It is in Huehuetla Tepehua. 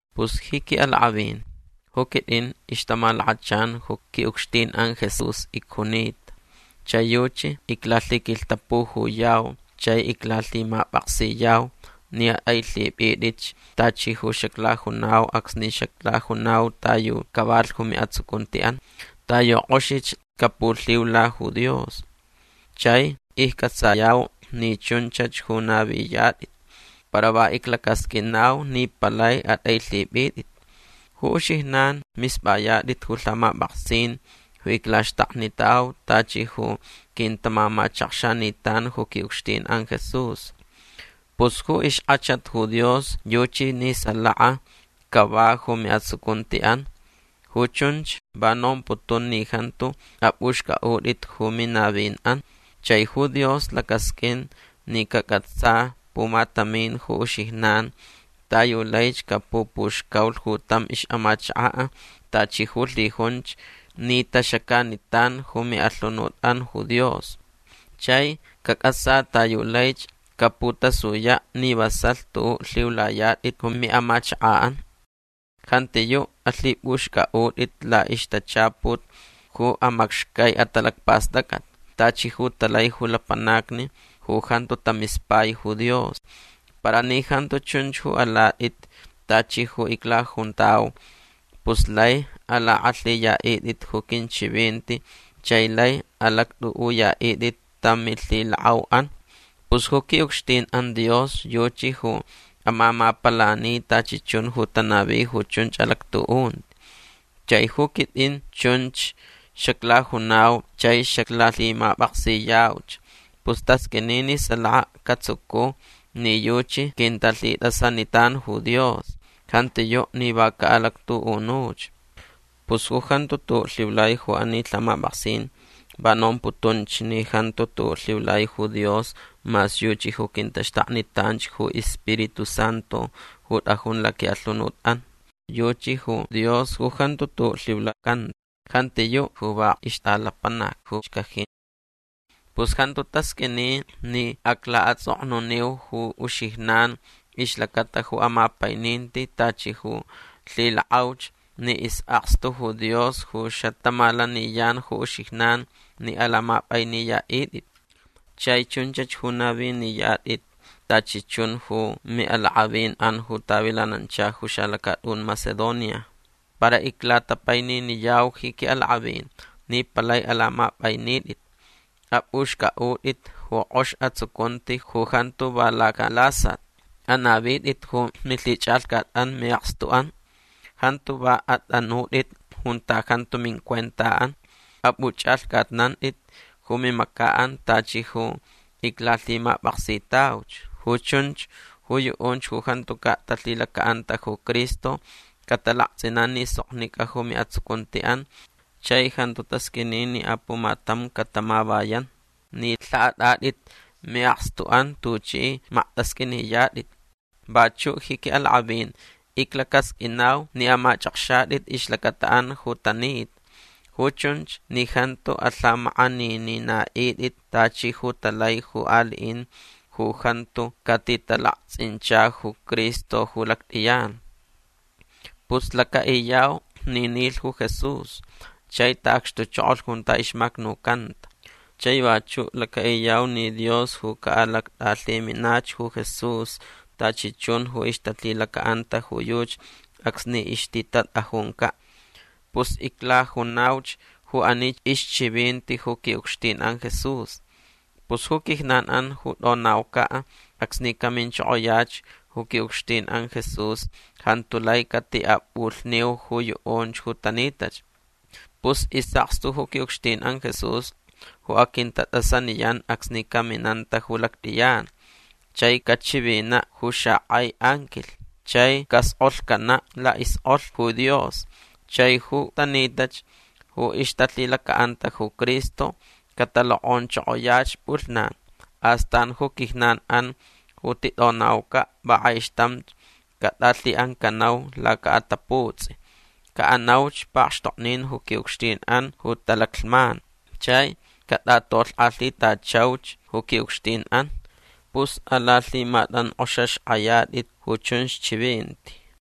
Pus ji qui'alak'avin ju quit'in ixtamalakachan ju qui'ucxtin'an Jesús icjunita. Chai yuchi iclalhiquilhtapujuyau chai iclalhimap'aksiyau ni at'ailhip'it'itch tachi ju xaclajunau acsni xaclajunau ta yu cavalh ju mi'atsucunti'an. Ta yu k'oxich capulhiula ju Dios. Chai icc'atsayau ni chunchach ju naviyat'it. Para va iclacasq'uinau ni palai at'ailhip'it'it. Ju uxijnan misp'ayat'it ju lhamap'aksin ju iclaxtaknitau tachi ju quintamamachakxanitan ju qui'ucxtin'an Jesús. Pus ju ixk'achat ju Dios yuchi ni salaka cava ju mi'atsucunti'an. Ju chunch va nomputun ni jantu ap'uxc'a'ut'it ju minavin'an. Chai ju Dios lacasq'uin ni cac'atsa pumatamin ju uxijnan ta yu laich capupuxcaulh ju tam ix'amachaka' tachi ju lhijunch ni taxacanitan ju mi'alhunut'an ju Dios. Chai cac'atsa ta yu laich caputasuya' ni vasalh tu'u' lhiulayat'it ju mi'amachaka'an. Jantiyu' alhip'uxc'a'ut'it la'ixtachaput ju amacxcai atalacpast'ac'at tachi ju talai ju lapanacni ju jantu tamispai ju Dios. Para ni jantu chunch ju alat'it tachi ju iclajuntau pus lai alak'alhiya'it'it ju quinchivinti chai lai alact'u'uya'it'it tam milhilak'au'an. Pus ju qui'ucxtin'an Dios yuchi ju amamapalani tachi chun ju tanavi ju chunch alactu'unti. Chai ju quit'in chunch xaclajunau chai xaclalhimap'aksiyauch. Pus tasq'uini ni salaka catsucu ni yuchi quintalhit'asanitan ju Dios. Jantiyu' ni va ca'alactu'unuch. Pus ju jantu tu'u' lhiulai ju ani lhamap'aksin va nomputunch ni jantu tu'u' lhiulai ju Dios mas yuchi ju quintaxtaknitanch ju iSpiritu Santu ju t'ajun laqui'alhunut'an. Yuchi ju Dios ju jantu tu'u' lhiulacan. Jantiyu' ju va ixt'alapanac ju xcaji. Pus jantu tasq'uini ni acla'ats'oknuniu ju uxijnan ixlacata ju amapaininti tachi ju lhilak'auch ni is'akstu ju Dios ju xatamalaniyan ju uxijnan ni alamap'ainiya'it'it. Chai chunchach ju naviniyat'it tachi chun ju mi'alak'avin'an ju tavilanancha ju xalacat'un Macedonia. Para iclatapaininiyau ji qui'alak'avin ni palai alamap'ainit'it. Ap'uxc'a'ut'it ju k'ox atsucunti ju jantu va lacalasat. Anavit'it ju milhich'alhcat'an mi'akstu'an. Jantu va at'anut'it junta jantu mincuenta'an. Ap'uch'alhc'atnant'it ju mimaca'an tachi ju iclalhimap'aksitauch. Ju chunch ju yu'unch ju jantuca' talhilaca'anta ju Cristo catalakts'inan ni soknic'a ju mi'atsucunti'an chai jantu tasq'uini ni apumatam catamavayan ni lha'at'at'it mi'akstu'an tuch'i makt'asq'uiniyat'it. Vachu' ji qui'alak'avin iclacasq'uinau ni amach'akxat'it ixlacata'an ju tanita. Ju chunch ni jantu alhamak'aninina'it'it tachi ju talai ju ali'in ju jantu catitalakts'incha ju Cristo ju lact'iyan. Pus laca'iyau ni nilh ju Jesús chai ta'acxtuchokolh junta ixmacnucanta. Chai vachu' laca'iyau ni Dios ju ca'alact'alhiminach ju Jesús tachi chun ju ixtalhilaca'anta ju yuchi acsni ixtitat'ajunca'. Pus iclajunauch ju ani ixchivinti ju qui'ucxtin'an Jesús. Pus ju quijnan'an ju t'onauca' acsni caminchokoyach ju qui'ucxtin'an Jesús jantu lai cati'ap'ulhniu ju yu'unch ju tanitach. Pus is'akstu ju qui'ucxtin'an Jesús ju aquintat'asaniyan acsni caminanta ju lact'iyan. Chai cachivina' ju xak'ai anquilh. Chai cask'olhcana' la'isk'olh ju Dios. Chai ju tanitach ju ixtalhilaca'anta ju Cristo catalok'onchokoyach p'ulhnan. Astan ju quijnan'an ju tit'onauca' va k'aixtamch cat'alhi'ancanau laca'ataputs'i. Ca'anauch pakxtoknin ju qui'ucxtin'an ju talaclhman. Chai cat'atolhk'alhitachauch ju qui'ucxtin'an. Pus alalhimatank'oxaxk'ayat'it ju chunch chivinti.